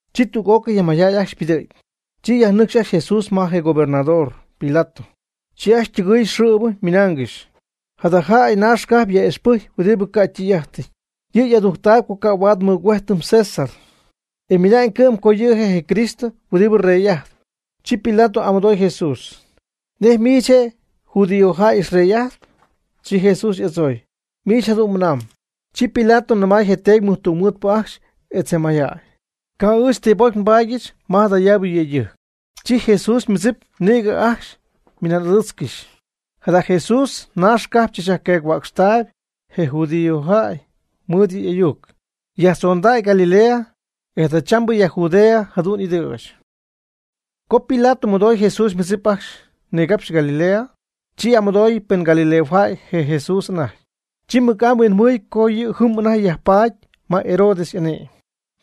Chi tüg'ócɨy je mayjäy ajcxy ypɨdɨ̈gy, chi yajnɨcxy ajcxy Jesús ma je gobernador Pilato. Chi ajcxy ytɨgɨɨy xɨ̈bɨ ymɨnaangɨxy: ―Jada jäy naax cajp yaj'ixpɨjcp huɨdi ca' ytɨy'ájtɨty. Yɨ' adujctähuam co ca' huaad nmɨgüéjtɨm César, e ymɨna'ñ cɨ'm co yɨ' je' je Cristo huɨdi rey'ajtpɨ. Chi Pilato y'amɨdooy Jesús: ―¿Nej miich je' judío jäy xyrey'ajtp? Chi Jesús y'adzooy: ―Miich jadu'n mɨnamb. Chi Pilato nɨmay je teedy tungmɨɨdpɨ ajcxy etz je mayjäy: ―Ca' ɨɨch ti pocy nbaadyɨch ma jadayaabɨ yëydɨjc. Chi Jesús ymɨdzip nïgɨ anajty ajcxy ymɨnan'adɨɨtzcɨxy: ―Jada Jesús naax cajp tzachyajqueec-huäcxtaayb je judíojäy mɨɨd yɨ' y'ayuc. Yajtzondacy Galilea, e jadachambɨ ya Judea jadu'n ɨdɨ̈ch. Co Pilato mɨdoy Jesús ymɨdzip ajcxy nigapxy Galilea, chi y'amɨdooy pen galileojäy je Jesús anajty. Chi mɨc'amy huinjɨhuɨy co yɨ' jɨm anajty yajpaady ma Herodes y'ane'my,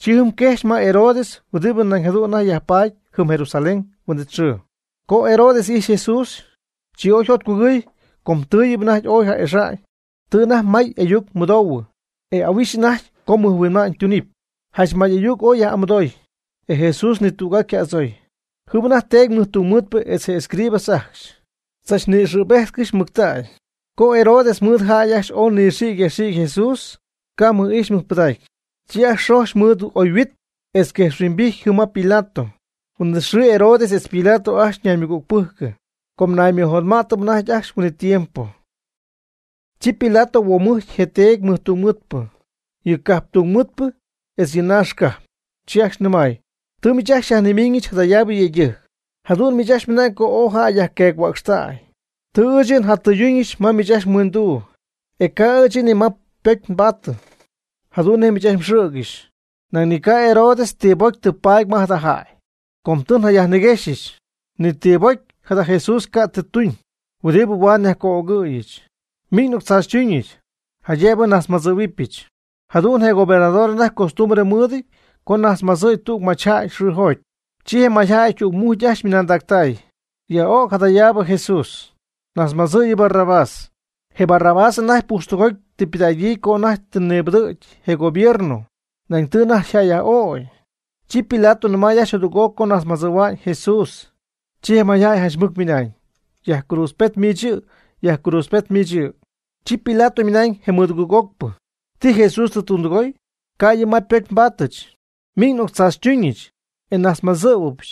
chi jɨm quejxy ma Herodes huɨdi nañ jadu'n anajty yajpatp jɨm Jerusalén huin'it xɨɨ. Co Herodes ijxy Jesús, chi oy jotcugɨɨy com tɨɨyɨp anajty ooy ja'ixa'ñ, tɨ anajty may ayuc mɨdoohuɨ, e ahuixy anajty co mɨjhuinma'ñ tunɨpy. Janch may ayuc ooy jayaj'amɨdoy, e Jesús ni tüg'aa ca' y'adzooy. Jɨm anajty teedy mɨjtungmɨɨdpɨ etz je escribas ajcxy, tzachnïgɨ̈béjtcɨxy mɨctägy. Chi Herodes mɨɨd yjäy ooy nɨxiicy yajxiicy Jesús, ca' mɨj'ijxy mɨjpɨdacy. Chi xojxy mɨɨd oyhuit etz quejxhuimbijty jɨm ma Pilato. Huin'it xɨɨ Herodes etz Pilato ajcxy ñaymɨgügpɨjcɨ, com naymɨjotma'tɨp anajty ajcxy huin'it tiempo. Chi Pilato huomujcy yɨ teedy mɨjtungmɨɨdpɨ, yɨ cajptungmɨɨdpɨ, etz yɨ naax cajp. Chi ajcxy nɨmay: ―Tɨ miich ajcxy xyajnimíngɨxyɨch jadayaabɨ yëydɨjc, jadu'n miich ajcxy mɨnamb co ooy jäy yajqueec-huäcxtay. Tɨ ɨɨch yɨ' jatɨyduñɨch ma miich ajcxy mhuindu, ca' ɨɨch yɨ' ni ma ypocy tɨ nbaatɨ, jadu'n nej miich ajcxy mxɨ̈gɨxy. Nañ ni ca' Herodes ti pocy tɨ paady ma jada jäy, com tɨ njayajniquexyɨch, ni ti pocy jada Jesús ca' tɨ tuñ huɨdi huaad nyajco'ögɨ̈yɨch. Miñ n'octzaachytuñɨch, jaydëbɨ nnajtzmadzɨ̈huɨbɨch. Jadu'n je gobernador anajty costumbre mɨɨdɨty co najtzmadzɨ̈y tüg machyjäy mɨjxɨɨjoty. Chi je mayjäy tügmucy ajcxy ymɨnaandacy: ―¡Yaj'ög jadayaab Jesús! ¡Najtzmadzɨ' yɨ Barrabás! Je Barrabás anajty pujxtɨgoty tɨ ypɨdägyii co anajty tɨ nibɨdɨ̈gy je gobierno, nañ tɨ anajty yjäyyaj'ögy. Chi Pilato nɨmay ajcxy jadüg'oc co najtzmadzɨ̈hua'ñ Jesús. Chi je mayjäy janch mɨc ymɨnañ: ―¡Yajcruudzpet miich yɨ'! ¡Yajcruudzpet miich yɨ'! Chi Pilato ymɨnañ je mɨdugɨɨg'ocpɨ: ―¿Ti Jesús tɨ tundɨgoy? Ca' yɨ' ma ypocy nbaatɨch. Miñ n'octzaachytuñɨch, e najtzmadzɨ̈huɨbɨch.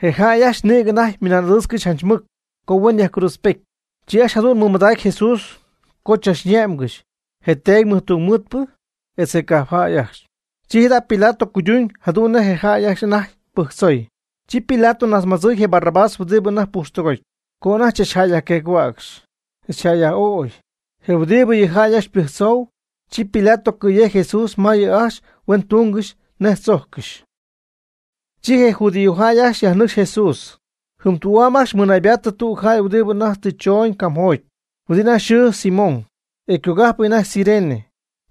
Je jäy ajcxy nïgɨ anajty ymɨnaan'adɨɨtzcɨxy janch mɨc, co huen yajcruudzpejty. Chi ajcxy jadu'n mɨmadacy Jesús co chachne'mgɨxy je teedy tungmɨɨdpɨ, etz je cajpjäy ajcxy. Chi jada' Pilato cuyduñ jadu'n nej je jäy ajcxy anajty pɨjctzoy. Chi Pilato najtzmadzɨɨy je Barrabás huɨdi anajty pujxtɨgótyɨp, co anajty chach jäy yajqueec-huäcxy, etz yjäyyaj'ögy, je' huɨdi yɨ jäy ajcxy ypɨjctzou. Chi Pilato cɨ̈yejcy Jesús ma yɨ' ajcxy huen tungɨxy nej tzojccɨxy. Chi je judíojäy ajcxy yajnɨcxy Jesús. Jɨm tü'am ajcxy mɨnaybaatɨ tüg jäy huɨdi anajty tɨ chooñ camjoty, huɨdi anajty yxɨɨ Simón, e ycogájpɨty anajty Cirene.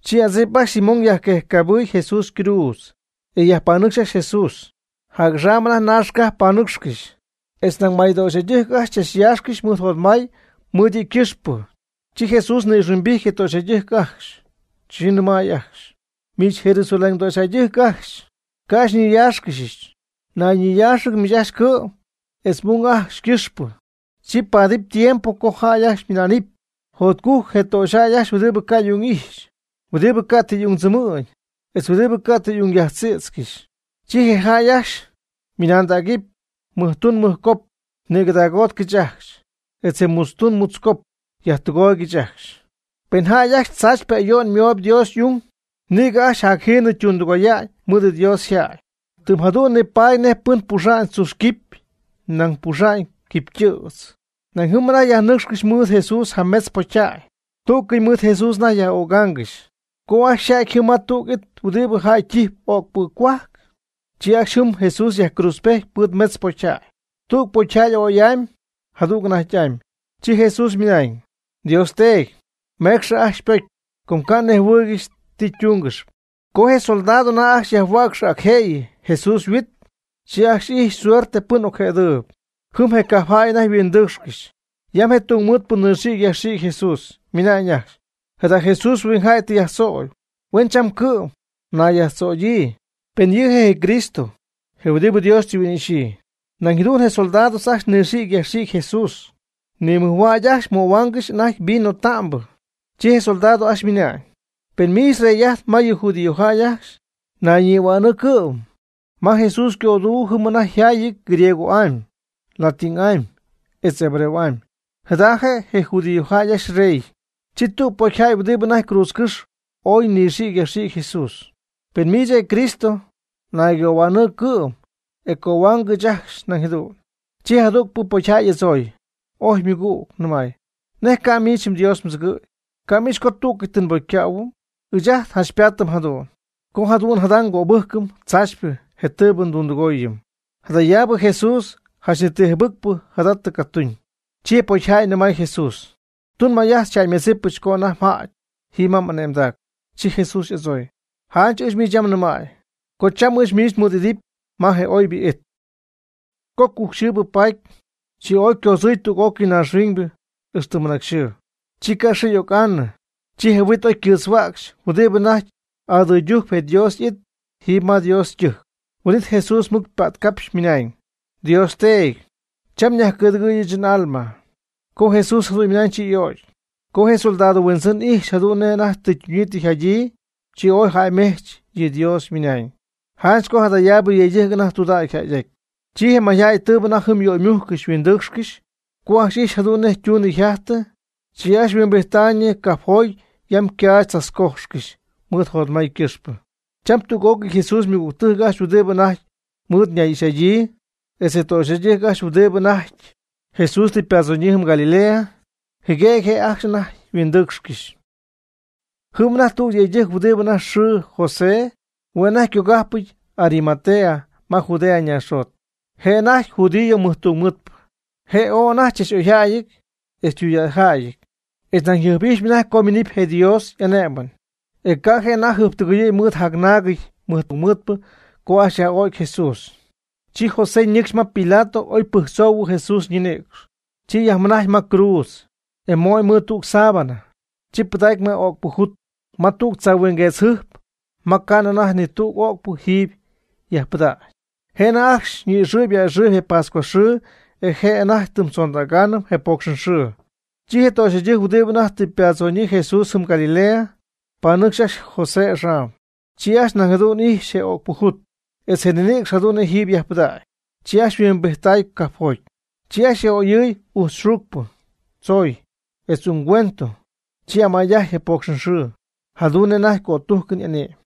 Chi adzip ajcxy Simón yajquejcycabɨy Jesús ycruudz, e yajpanɨcxy ajcxy Jesús. Jac'axam anajty naax cajp panɨcxcɨxy, etz nañ may töxyjäydɨjc ajcxy chachyaaxcɨxy mɨɨd jotmay mɨɨd yɨ' ycɨxpɨ. Chi Jesús ni'ijxhuimbijty je töxyjäydɨjc ajcxy, chi nɨmay ajcxy: ―Miich Jerusalén töxyjäydɨjc ajcxy, ca' xyñiyáaxcɨxɨch. Nayñiyaaxɨgɨx miich ajcxy cɨ'm etz m'ung ajcxy ycɨxpɨ. Chi ypaadɨpy tiempo co jäy ajcxy ymɨna'nɨpy: “Jotcujc je töxyjäy ajcxy huɨdi ca' y'ung ixy, huɨdi ca' tɨ y'ungtzɨmɨ̈gy, etz huɨdi ca' tɨ y'ung yajtzïtzcɨxy.” Chi je jäy ajcxy nɨmaydägɨpy mɨjtun mɨjcop: “Nïgɨdagótcɨch ajcxy”; etz je mutztun mutzcop: “Yajtɨgooygɨch ajcxy.” Pen jäy ajcxy tzaachypɨ ayo'n mooyb Dios y'ung, nïgɨ ajcxy jacjiinɨ ytundɨgoya'ñ mɨɨd Dios yjäy, tɨm jadu'n nipaady nej pɨn puxam tzuxy quipy nañ puxamy quipy tɨ̈tzpɨ. Nañ jɨm anajty yajnɨcxcɨxy mɨɨd Jesús jametz pocyjäy. Tú'cɨy mɨɨd Jesús anajty yaj'ögaangɨxy. Co ajcxy oyjäty jɨm ma tüg it huɨdi jäy ytijpy ögpɨ cohuajc, chi ajcxy jɨm Jesús yajcruudzpejty mɨɨd metz pocyjäy: tüg pocyjäy a'oy'amy, jadüg anajty'amy. Chi Jesús ymɨnañ: ―Dios Teedy, mecxɨ ajcxy ypocy, com ca' nejhuɨɨygɨxy ti ytungɨxyp. Co je soldados anajty ajcxy yajhuäcxaanɨ ac je'y Jesús yhuit, chi ajcxy ijxy suerte pɨn ocjëdɨɨb. Jɨm je cajpjäy anajty yhuindɨɨcxcɨxy, yam je tungmɨɨdpɨ nɨxïgy yajxïgy Jesús, ymɨnañ ajcxy: ―Jada Jesús huingjäy tɨ yajtzögy, huen cham cɨ'm nayyajtzögyii, pen yɨ' je' je Cristo, je huɨdi Dios tɨ huin'ixyɨ. Nañ jadu'n je soldados ajcxy nɨxiiccɨxy yajxiiccɨxy Jesús, nimɨjhuägy ajcxy möhuaangɨxy anajty vino ta'mbɨ. Chi je soldados ajcxy ymɨnañ: ―Pen miich Rey'ajt ma yɨ judíojäy ajcxy, nayñihuänɨɨ cɨ'm. Ma Jesús ycödu jɨm anajty yjaayɨty griego'amy, latin'amy, etz hebreo'amy: JADA JE' YƗ JUDIOJÄY AJCXY YREY. Chi tüg pocyjäy huɨdi anajty cruudzcɨ́xy ooy nɨxiicy yajxiicy Jesús ymɨnañ: ―Pen miich je' je Cristo, naygohuänɨɨ cɨ'm, e cohuaangɨch ɨɨch ajcxy nañ jadu'n. Chi je jadügpɨ pocyjäy oy y'adzooy, ojy ymɨgüg, nɨmay: ―¿Nej ca' miich Dios mdzɨgɨ̈y. Ca' m'ixy co tú'cɨy tɨ nbócycähuɨm? Ɨɨch ajt janch paatɨp jadu'n, co jadu'n jada ngöbɨ́jcɨm tzaachypɨ je tɨɨbɨ ndundɨgooyɨm. Jadayaabɨ Jesús janch ni ti jɨbɨcpɨ jada tɨ catuñ. Chi je pocyjäy nɨmay Jesús: ―Tun may'ajt xyjäymedzɨpɨch co anajty mjäty jiiby ma m'ane'mdac. Chi Jesús oy y'adzooy: ―Janch ɨɨch miich yam nɨmäy co cham ɨɨch miich mɨɨd'íjtnɨpy ma je oybɨ it. Co cujcxɨɨbɨ paty, chi oy ycoodzɨ̈y tüg'ócɨy naaxhuiñ ixtɨ mɨnacyxɨɨnɨ. Chi xɨɨ ca' y'oc'anɨ. Chi je huit oy ycɨɨtzhuäcxy huɨdi anajty adɨɨydujcp je Dios y'it jiiby ma Dios ytɨjc. Huin'it Jesús mɨc ypätcapxy ymɨnañ: ―Dios Teedy, cham nyajcɨ̈dɨgɨ̈y ɨɨch n'alma. Co Jesús jadu'n ymɨnañ chi y'ögy. Co je soldado huindzɨn ijxy jadu'n nej anajty tɨ ytunyii tɨ yjadyii, chi ooy jäymejch yɨ Dios ymɨnañ: ―Janch co jadayaabɨ yëydɨjc anajty tudägy yjäyɨty. Chi je mayjäy tɨɨbɨ anajty jɨm yöymújccɨxy yhuindɨɨcxcɨxy, co ajcxy ijxy jadu'n nej ytuunɨ yjajtɨ, chi ajcxy huimbijttaayñɨ cajpjoty yam ycaach tzachcójxcɨxy mɨɨd jotmay ycɨxpɨ. Cham tüg'ócɨy Jesús ymɨgügtɨjc ajcxy huɨdi anajty mɨɨd ñay'ixy'adyii, etz töxyjäydɨjc ajcxy huɨdi anajty Jesús tɨ ypadzonyii jɨm Galilea, jɨguëgy je' anajty ajcxy yhuindɨɨcxcɨxy. Jɨm anajty tüg yëydɨjc huɨdi anajty yxɨɨ José, hue' anajty ycogájpɨty Arimatea ma Judea naaxjot. Je' anajty judío mɨjtungmɨɨdpɨ, e je' ooy anajty chach'oyjäyɨty etz ytudägyjäyɨty. Je' nañ yjɨjp'ijxy anajty co yminɨpy je Dios y'ané'mɨn, e ca' je' anajty jɨjptɨgɨyɨ̈y mɨɨd jacnaagɨty mɨjtungmɨɨdpɨ co ajcxy yaj'ögy Jesús. Chi José ñɨcxy ma Pilato oy pɨjctzoohuɨ Jesús ñinïcx. Chi yajmɨnajcy ma cruudz, e mo'ñ mɨɨd tüg sábana, chi pɨdacy ma ögpɨ jut, ma tüg tzaahuinguetzmɨjc ma ca'nɨ anajty ni tüg ögpɨ jiiby yajpɨdägyp. Je' anajty ajcxy ni'ɨxɨɨyb a'ɨxɨɨyb je pascua xɨɨ e je' anajty tɨm tzondägan je pócxɨn xɨɨ. Chi je töxyjäydɨjc huɨdi anajty tɨ ypadzoñyii Jesús jɨm Galilea, panɨcxy ajcxy je José axam. Chi ajcxy nañ jadu'n ijxy je ögpɨ jut, etz je ninïcx jadu'n nej jiiby yajpɨdacy. Chi ajcxy yhuimbijttay cajpjoty. Chi ajcxy yaj'oyɨɨy ujtz xuucpɨ, tzoy, etz ungüento, chi amay'ajty je pocxɨnxɨɨ, jadu'n nej anajty cötújcɨn y'ane'my.